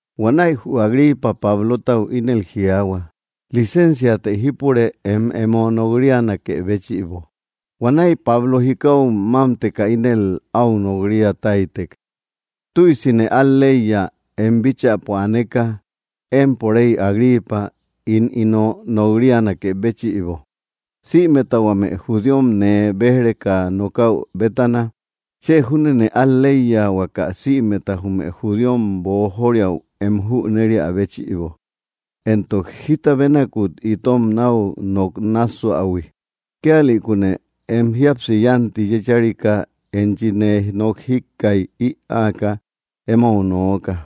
Huanäi jü Agripa Pablotau ínel jiaahua: —Licénsiatë jípure em emo nok‑rianakë béchïbo. Huanäi Pablo jikau mámteka ínel áu nok‑ria táytek: —Tüisine al‑leiya em bíchäpo aneka, empo rey Agripa, ín ino nok‑rianakë béchïbo, sïmeta huame judíom nee béj‑reka nokäu bétana. Chë júnene al‑leiya, huaka sïmeta jume judíom boojoriau em jüneria béchïbo, éntok jita bénakut itom nau nok nássuähui. Kíalïkune em jíapsi yánti yécharika enchi nee nok jíkkaij ïaaka emou nooka.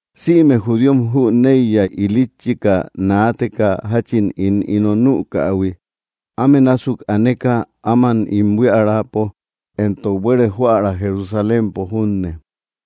’Sïme judíom jüneiya ilitchika naateka jachin ín ino nükähui, áme násuk aneka áman ín buíaräpo éntok buere joära Jerusalémpo junne.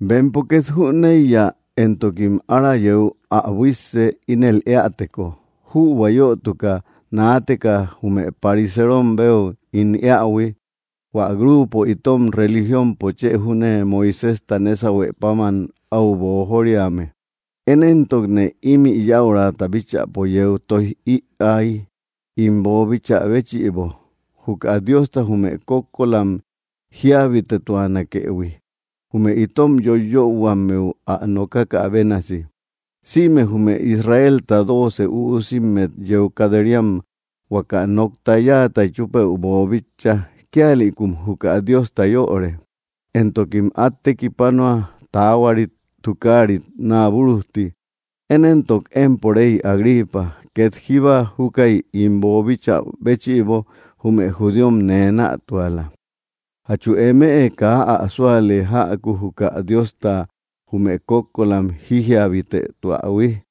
Bempo ket jüneiya, éntokim ára yéu ä buisse ínel eäteko, jübua yötuka naateka jume parisérom béu ín éaïhui, hua grupo itom religionpo chë júne Moiséjta nésahue páman au boojóriame. Én éntokne imi yäurata bíchäpo yeu toij iäi ín boobíchä béchïbo, juka Diosta jume kókkolam jíabitetuanakëhui, jume itom yoiyöhuammeu ä nokákä bénasi. Sïme jume Israelta dóoce üusimmet yeu kat‑ríam huaka nokta yáata chúpëu boobíchaïhui, kíalïkum juka Diosta yöre, éntokim at tekipánoa taáhuarit tukáarit naabúrujti. Én éntok, empo rey Agripa, ket jíba júkäi ín boobíchä béchïbo, jume judíom nee nätuala. ¿Jatchu eme kaa ä súale jäku juka Diosta jume kókkolam jíjiabitetuähui?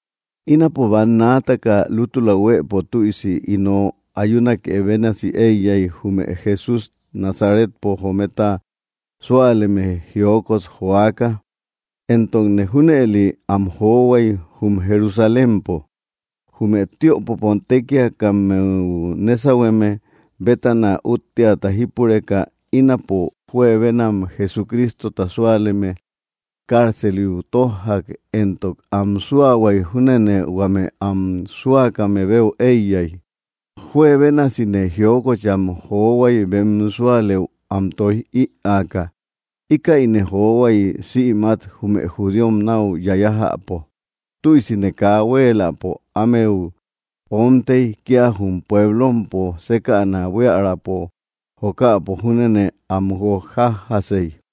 ’Ínapo bannaataka lútula huëpo tüisi ino ayúnake bénasi eiyai jume Jesús Nazaretpo jometa súaleme jiókot joaka. Éntokne junëli am johuai jum Jerusalémpo. Jume tiöpopo tékiakammeu nésauhueme bétana útteata jípureka, ínapo juebénam Jesucrístota súaleme cárceliu tójjak, éntok am súahuai júnene huame am súakame beu eiyai. Juebénasine jiókocham johuai bem súalëu am toij ïaaka. Íkäine johuai sïmat jume judíom nau yayajäpo. Tüisine kaa huéeläpo ámeu omtei, kia jum puéblompo sékäna buíaräpo jokäpo júnene am guokjájasei.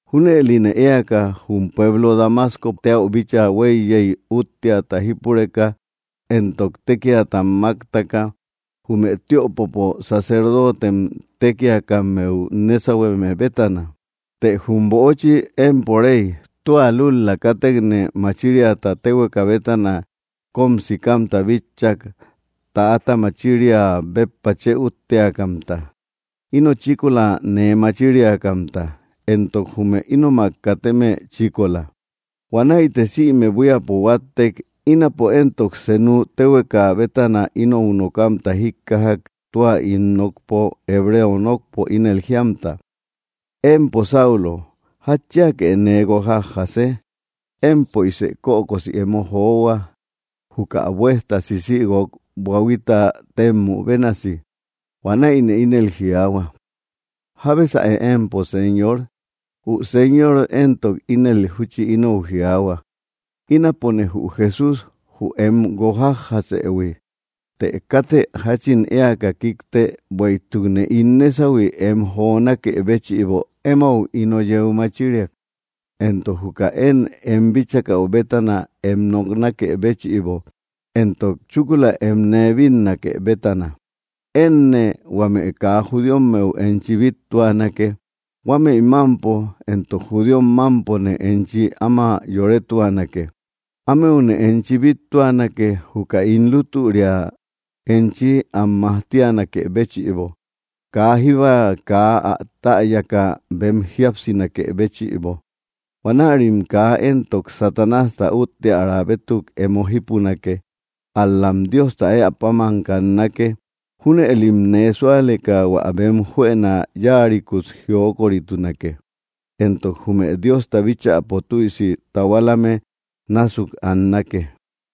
’Júnëline éaka jum pueblo Damascou bíchaa hueiyei, útteata jípureka éntok tékiata máktaka jume tiöpopo sacerdote tékiakammeu nésauhueme bétana. Të jum böchi, empo rey, tua lútula kátekne machíriata téhueka bétana kom sikamta bitchak täata machiria béppa chë útteakamta, ino chíkola nee machíriakamta, éntok jume ínomak kateme chíkola. Huanäite sïme buíapo huáttek. Ínapo éntok, senuk téhueka bétana inou nokamta jíkkajak tua ín nokpo, hebreo nokpo, ínel jíamta: “Empo Saulo, ¿jatchíake nee guokjájase? Empöisë kökosi emo johua, juka buesta sísïguok buahuita témmü bénasi.” Huanäine ínel jiaahua: “¿Jábesaë empo, Señor?” Jü Señor éntok, ínel júchi inou jiaahua: “Ínapone jü Jesús, jü em guokjájjasëhui. Të kátë jachin éaka kikte, bueïtukne ín nésauhui em jonákë béchïbo emou ino yeu machíriak, éntok juka én em bíchakäu bétana em noknákë béchïbo, éntok chúkula em nee bínnake bétana. Énne huame kaa judíommeu enchi bittuanake. Huámëi mampo, éntok judíom mámpone enchi áma yorétuanake. Ámeune enchi bíttuanak juka ín lútüria enchi am majtíanakë béchïbo, kaa jíba kaa ä täyaka bem jíapsinakë béchïbo. Huanärim kaa éntok Satanásta útteara bétuk emo jípunake, ál‑lam Diosta éä páman kannake. Júnëlim nee súaleka hua bem juëna yáarikut jiókoritunake éntok jume Diosta bíchäpo tüisi tahualame násuk annake.”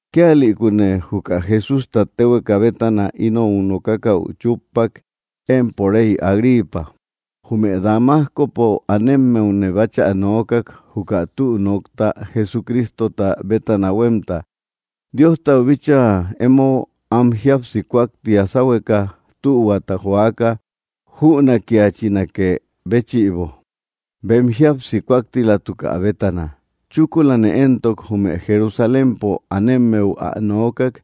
’Kíalïkune juka Jesústa téhueka bétana inou nokákäu chúppak, empo rey Agripa. Jume Damascopo anémmeune báchä noókak juka tü nokta Jesucrístota bétana huemta, Diostau bíchaa emo an jíapsi kúakti sáhueka tühuata joaka jünakiachinakë béchïbo bem jíapsi kúaktilatukä bétana. Chúkulane éntok, jume Jerusalémpo anemmeu ä noókak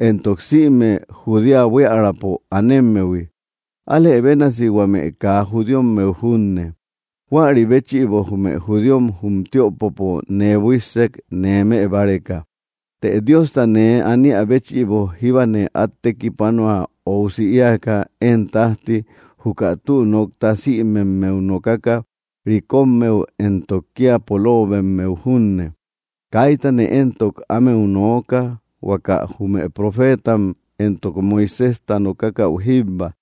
éntok sïme Judea buíaräpo anémmehui, álë bénasi huame kaa judíommeu junne. Juäri béchïbo jume judíom jum tiöpopo nee buíssek nee mëbáreka. Të Diosta nee aniä béchïbo jíbane at tekipánoa óusi éaka én tajti, juka tü nokta sïmemmeu nokaka, rikommeu éntok kia polóobemmeu junne. Kaítane entok ámeu nooka huaka jume profétam éntok Moiséjta nokákäu jíbba,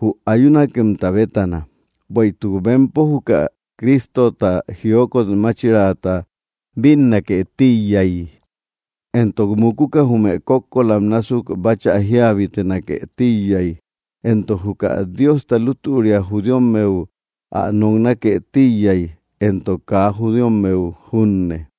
jü ayúnakemta bétana. Bueïtuk bempo juka Crístota jiókot máchirata bínnake tíiyai, éntok mukuka jume kókkolam násuk báchä jíabitenake tíiyai, éntok juka Diosta lútüria judíommeu ä noknákë tíiyay, éntok kaa judíommeu junne.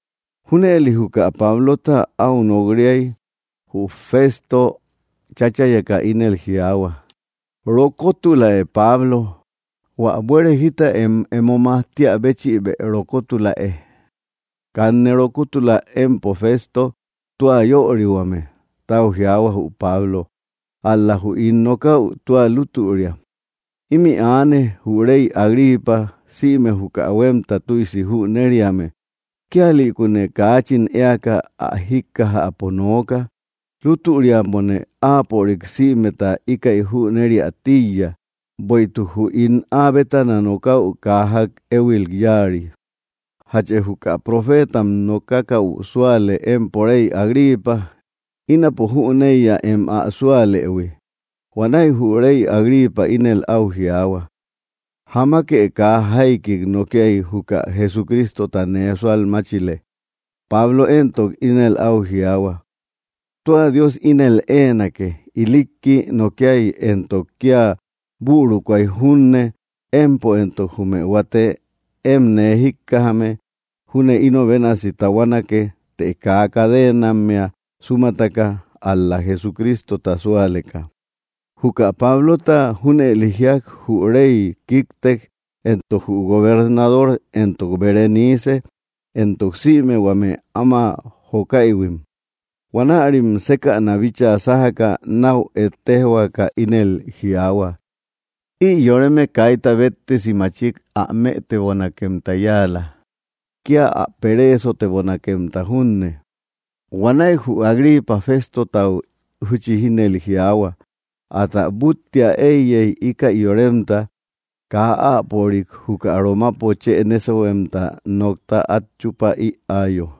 Júnëli juka Pablota au nok‑riai, jü Fésto cháchayeka ínel jiaahua: —¡Rokotuläe, Pablo! Huä buere jita em emo majtíä béchïbë rokótulaë. —Kanne rokótula, empo Fésto tua yörihuame —tau jiaahua jü Pablo—, ál‑la jü ín nokäu tua lútüria. Imi aane jü rey Agripa sïme juka huemta tüisi jüneriame, kíalïkune kaachin éaka áa jíkkajäpo nooka. Lútüriapone áapörik sïmeta íkäi jünériä tíiya, bueïtuk jü ín áa bétana nokäu kaa jak éhuil yáari. ¿Játchë juka profétam nokákäu súale, empo rey Agripa? Ínapo jüneiya em ä súalëhui. Huanäi jü rey Agripa ínel au jiaahua: —Jamake kaa jaiki nokiai juka Jesucrístota nee sualmáchile. Pablo éntok, ínel au jiaahua: —Tua Dios ínel éenake, ilikki nokiai éntok kia bürukuai junne, empo éntok jume huate én nee jíkkajame júne ino bénasi tahuánake, të kaa cadenammea súmataka, ál‑la Jesucrístota súaleka. Juka Pablota junëli jíak, jü rey kíktek, éntok jü gobernador, éntok Berenice, éntok sïme huame áma jokáïhuim. Huanärim sékäna bíchaa sájaka, nau ettéjhuaka ínel jiaahua: —Ï yoreme kaita béttesi machik ä mëtebonakemta yáala, kia ä peréesotebonakemta junne. Huanäi jü Agripa Féstotau júchi ínel jiaahua: —Átä búttiä eiyei íkäi yoremta kaa áapörik juka Romapo chë nésauhuemta nokta at chupa ïaayo.